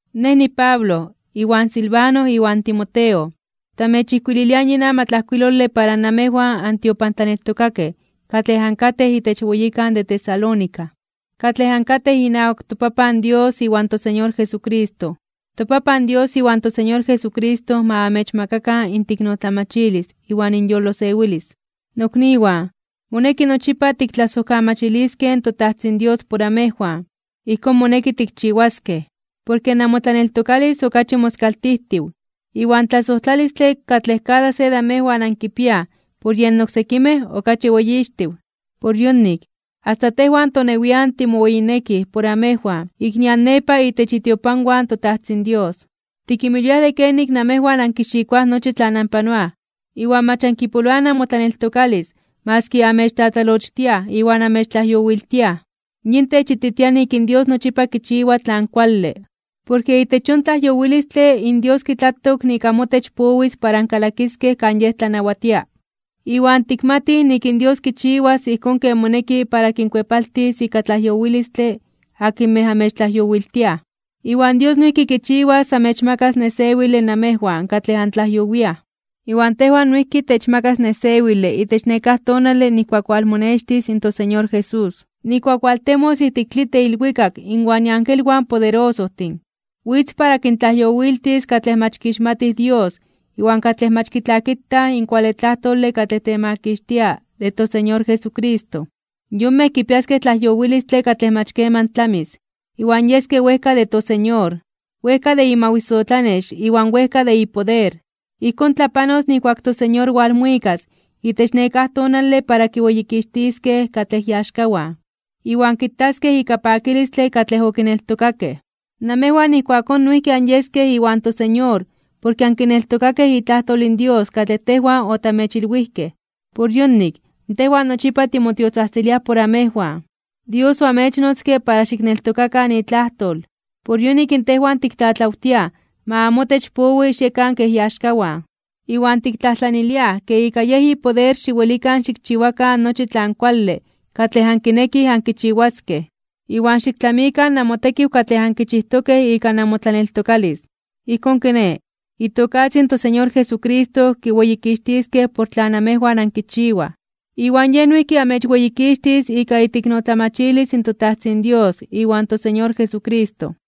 Nej niPablo, iwan Silvano iwan Timoteo, tamechijkuililiaj yin amatlajkuilole para namejwan antiopantlaneltokakej katlej ankatej itech weyikan de Tesalónica, katlej ankatej inawak toPapan Dios iwan toSeñor Jesucristo. ToPapan Dios iwan toSeñor Jesucristo ma amechmakakan inteiknotlamachilis iwan inyolosewilis. Nokniwan, moneki nochipa tiktlasojkamachiliskej in toTajtzin Dios por amejwan. Ijkón moneki tikchiwaskej, porke namotlaneltokalis okachi moskaltijtiw, iwan tlasojtlalistle katlej kada se de amejwan ankipiaj por yen oksekimej okachi weyixtiw. Por yonik, asta tejwan tonewian timoweyinekij por amejwan ik nian nepa itech itiopanwan in toTajtzin Dios. Tikinmilwiaj de kenik namejwan ankixikoaj nochi tlan anpanoaj, iwan mach ankipoloaj namotlaneltokalis maski anmechtlatlalochtiaj iwan amechtlajyowiltiaj. Yin techititia nik in Dios nochipa kichiwa tlan kuale, porke itech yon tlajyowilistle in Dios kitlatok nik amotech powis para ankalakiskej kan Yej tlanawatia. Iwan tikmatij nik in Dios kichiwas ijkón ken moneki para kinkuepaltis ika tlajyowilistle akinmej amechtlajyowiltiaj. Iwan Dios noijki kichiwas amechmakas nesewile namejwan katlej antlajyowiaj. Iwan tejwan noijki techmakas nesewile itech nekáj tonale nijkuak walmonextis in toSeñor Jesús, nijkuak waltemos ijtik tlitl de ilwikak inwan iangelwan poderosojtin. Witz para kintlajyowiltis katlej mach kixmatij Dios iwan katlej mach kitlakitaj in kuale tlajtole katlej temakixtia de toSeñor Jesucristo. Yonmej kipiaskej tlajyowilistle katlej mach keman tlamis, iwan yeskej wejka de toSeñor, wejka de imawisotlanex iwan wejka de ipoder. Ijkón tlapanos nijkuak in toSeñor walmuikas itech nekáj tonale para kiweyikixtiskej katlej iaxkawan, iwan kitaskej ika pakilistle katlej okineltokakej. Namejwan ijkuakón noijki anyeskej iwan toSeñor porke ankineltokakej itlajtol in Dios katlej tejwan otamechilwijkej. Por yonik, tejwan nochipa timotiotzajtziliaj por amejwan. Dios oamechnotzke para xikneltokakan itlajtol. Por yonik in tejwan tiktlatlawtiaj ma amotech powi xiekan kej iaxkawan. Iwan tiktlajtlaniliaj ke ika Yej ipoder xiwelikan xikchiwakan nochi tlan kuale katlej ankinekij ankichiwaskej, iwan xiktlamikan namotekiw katlej ankichijtokej ika namotlaneltokalis. Ijkón kiné, itokatzin in toSeñor Jesucristo kiweyikixtiskej por tlan amejwan ankichiwaj, iwan Yej noijki amechweyikixtis ika iteiknotlamachilis in toTajtzin Dios iwan toSeñor Jesucristo.